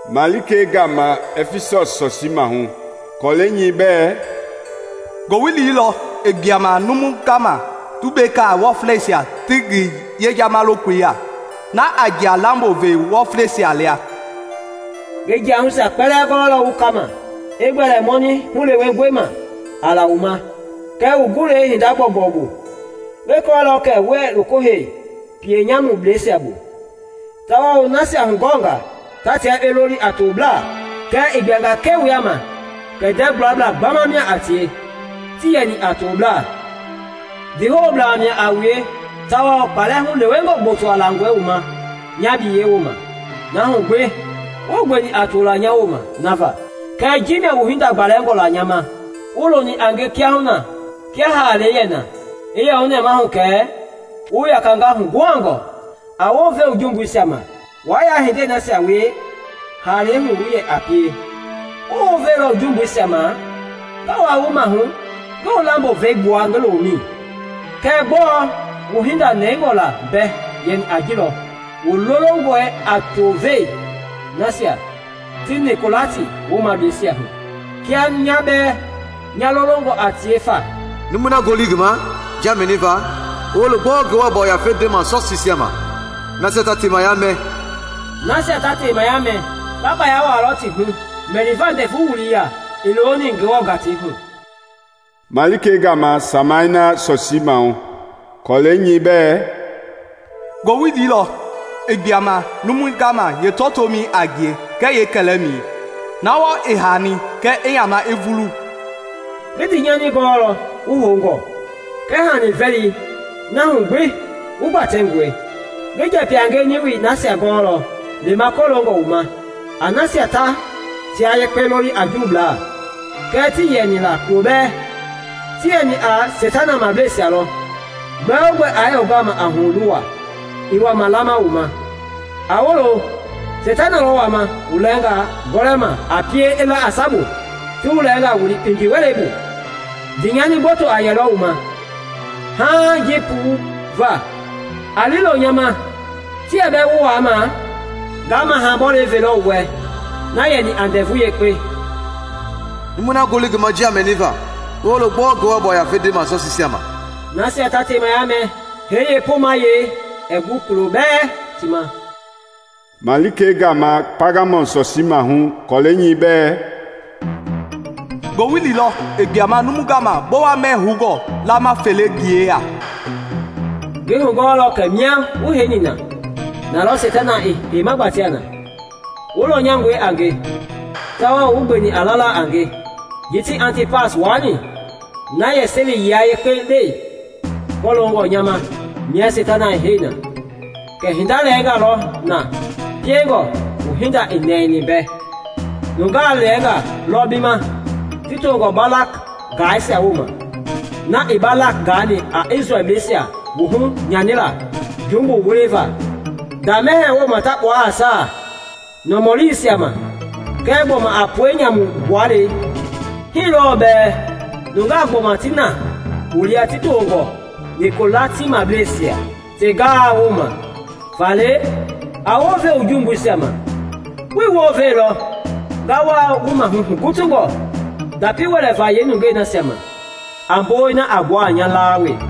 “Malikei gama Ɛfisɔs sɔsii maahu, kɔlɛi nyɛi bɛ: “Ngowili lɔ i gbuama numui gama tumbeka wɔfleisia ti ngi yejama lokoi ya, na a ŋia lambo vɛ wɔfleisia lia. Ngi jiahuisia kpɛlɛɛ gɔɔlɔ wu kama; i gbɛli mɔnɛ hulewengɔi ma a la wu ma kɛɛ wu gulɛi hinda gbɔugbɔu bu. Ngi kɔɔlɔ kɛ wuɛɛ loko hei pienyamubleisia bu, tawao wu nasia hugɔnga ta tia yekpe loli a tobla, kɛɛ i gbuanga ke wu yaama kɛ ndɛɛ gulablaa gbama mia a tie, tii yɛni a tobla. Ndiihoublaa mia a wue tawao kpalɛ hulewengɔ gbotoa langɔe wu ma nya biyɛi woma, na hu gbi, wuii gbeni a tola nya woma nava. Kɛɛ ji mia wu hinda gbalɛngɔ la nya ma: Wuii loni a nge kiahuna kia haalei yɛ na. I yɛ wu nɛmahu kɛ wu yakanga huguhangɔ! A wounve wu jumbuisia ma wa ya hindei nasia wie haalɛi hu wu yɛ pie. Wuii wounveilɔ wu jumbuisia ma, nga waa wu maahu ngi wu lambo vɛi gbua ngi loomɛi. Kɛɛ gbɔɔ wu hinda nɛngɔ la mbɛ yɛni a jilɔ: Wu lolongɔe a tuve nasia ti Nikolati woomableisia hu, kia nya bɛɛ nya lolongɔ a tie fa. “Numui na ngoli i ngi ma njia mɛniva, i woolo gbɔɔ Ngewɔ Yafei ndema sɔsiisia ma! “Nasia ta temaya mɛ nga kpaya wuaalɔ ti hu mɛliva ndɛvu wuliya i looni Ngewɔ gatei hu.” “Malikei gama Simana sɔsii maahu, kɔlɛi nyɛi bɛ: “Ngowili lɔ i gbuama numui gama yeetɔtoomɛi a ngie kɛɛ yeekɛlɛmɛi, na wɔɔ i haani kɛ i yamaa i vulu. Ngi ndii nyani gɔɔlɔ wu houngɔ kɛɛ hani vɛli na hugbi wu gbatɛngɔi! Ngi njɛpɛ-a-ngie niwi nasia gɔɔlɔ lema kɔloongɔ wu ma a nasia ta tia yekpe loli a Juublaa, kɛɛ tii yɛni la kulobɛɛ, ti yɛni a seitana mablɛisia lɔ! Gbɛogbɛ aa yɛ wu gama a huluwa i wama lama wu ma. A woolo! Seitana lɔ wama wu lɛnga gɔlɛma a pie i la a sabu ti wu lɛnga wili kpindi wɛlei bu; ndiinyani gboto a yɛlɔ wu ma haaŋ jii puu va. A lii loo nya ma, ti yɛ bɛɛ wu waama, nga maha bɔlɔ velɔ wu wɛ na yɛni a ndɛvu yekpe. “Numui na ngoli i ngi ma njia mɛniva, i woolo gbɔɔ Ngewɔ Yafei ndema sɔsiisia ma!” “Nasia ta temaya mɛ, hee yeepomayee ɛɛ gu kulo bɛɛ ti ma.” “Malikei gama Paagamɔm sɔsii maahu, kɔlɛi nyɛi bɛ: “Ngowili lɔ i gbuama numui gama bowa mɛɛ houngɔ laama felei ngi yeya. Ngi hugɔɔlɔ kɛ mia wu heini na, nalɔ Seitana i heima gbatea na. Wu lɔnyangɔe a nge, tawao wuii gbeni a la la a nge ji ti Antipas waani na yɛ seli yia yekpe le kɔloongɔ nya ma mia seitana i hei na. Kɛɛ hinda lɛnga lɔ na na piengɔ wu hinda ii nɛɛni bɛ: Nungaa lɛnga lɔ bi ma ti tongɔ Balam gaaisia woma, na i Balak gaani a Isrɛlbleisia wuhu nyanila jumbu wuliva nda mɛhɛɛ wooma ta kpua a saa nɔmɔliisia ma, kɛɛ gbɔma a pue nyamu gbualei. Hii lɔɔ bɛɛ nungaa gbɔma ti na wu lia ti toongɔ Nikolatibleisia ti gaa woma. Faale a wounve wu jumbuisia ma! Wuii wounveilɔ, nga waa wu maahu hugutungɔ ndapi wɛlɛva yeenungɛi nasia ma a bowei na a gbua a nya laa we.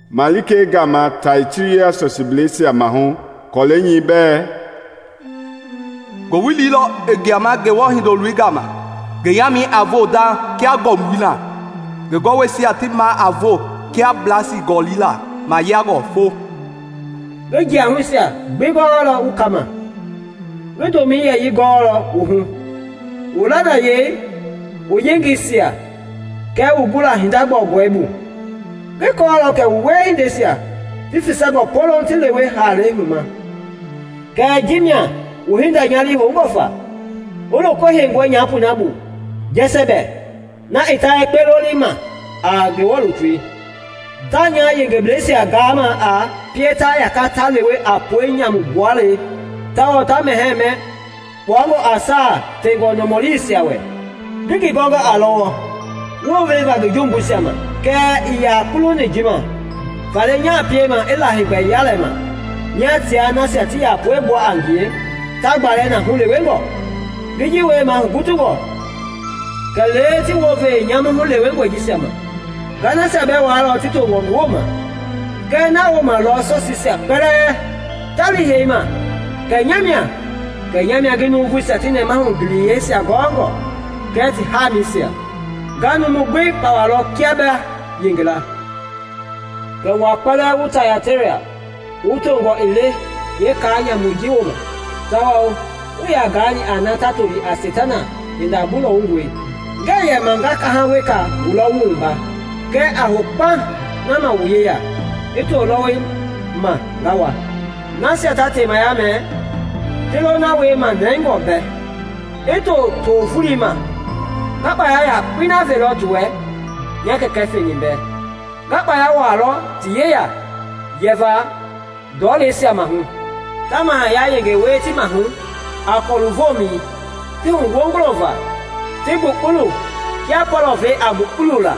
“Malikei gama Tayatira sɔsiibleisia maahu, kɔlɛi nyɛi bɛ: “Ngowili lɔ i gbuama Ngewɔ Hindoloi gama, ngi yaamɛi a voo dauŋ kia ngɔmbui na, ngi gɔwɔisia ti maa a voo kia blasi gɔli na mayiangɔ fo. Ngi jiahuisia gbi gɔɔlɔ wu kama. Ngi domɛi yɛyii gɔɔlɔ wu hu, wu lanayei, wu yengeisia, kɛɛ wu gula hinda gbɔugbɔu bu. Ngi kɔɔlɔ kɛ wu wiehindeisia ti fesani poloŋ ti lewe haalei huma. Kɛɛ ji mia wu hinda nya lii houngɔ fa: Wu loko heingɔi nyapoi na bu Jɛsɛbɛ, na i tayekpe lolima a Ngewɔ lutui. Taa nya yengebleisia gaama a pie ta yaka ta lewe a pue nyamu gbualei tao ta mɛhɛɛ mɛ kpuangɔ a saa fengɔ nɔmɔliisia wɛ. Ngi ngi gɔnga a lɔwɔ wounve va ngi jumbuisia ma, kɛɛ ii yaa kuluni ji ma. Faale nya piema i la heegbɛ yalema mia tia nasia ti yɛ pue gbua a ngie ta gbalɛ na hulewengɔ. Ngi ji wiemaa hugutungɔ kɛlee ti wounve yeenyamu hulewengɔi jisia ma. Nga nasia bɛɛ waalɔ ti toongɔ ngi woma, kɛ nawooma lɔ sɔsiisia kpɛlɛɛ ta lii hei ma kɛ nya mia ngi nuuvuisia ti nɛmahu giliyeisia gɔɔngɔ kɛɛ ti hamiisia. Nga numui gbi pawalɔ kia ba yengela. “Kɛɛ wua kpɛlɛɛ wu Tayatira wu toongɔ ii le yeekaa nyamui ji woma, tawao wuii yaa gaani a na ta toli a ‘Seitana hinda mbulɔwungɔi,’ ngɛɛ yɛma nga kaha weka wulɔ wu wumba. Kɛɛ a hou kpauŋ na ma wu yeya i too lɔwɔi ma nga wa. Nasia ta temaya mɛ, ti lo na wiema nɛngɔ bɛ i to fa too voloi ma, nga kpaya yakpei na velɔ ti wɛ nya kɛkɛ feni bɛ: Nga kpaya wuaalɔ ti yeya yɛva ndɔleisia maahu, ta mahaya yenge wie ti maahu a kɔlu vomɛi ti huwongolo va ti gbukpulu kia pɔlɔvɛi a gbukpuula.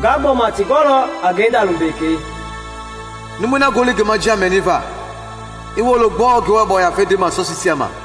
Nga gbɔma ti gɔlɔ a ngenda lumbekei. “Numui na ngoli ngi ma njia mɛniva, i woolo gbɔɔ Ngewɔ Yafei ndema sɔsiisia ma!”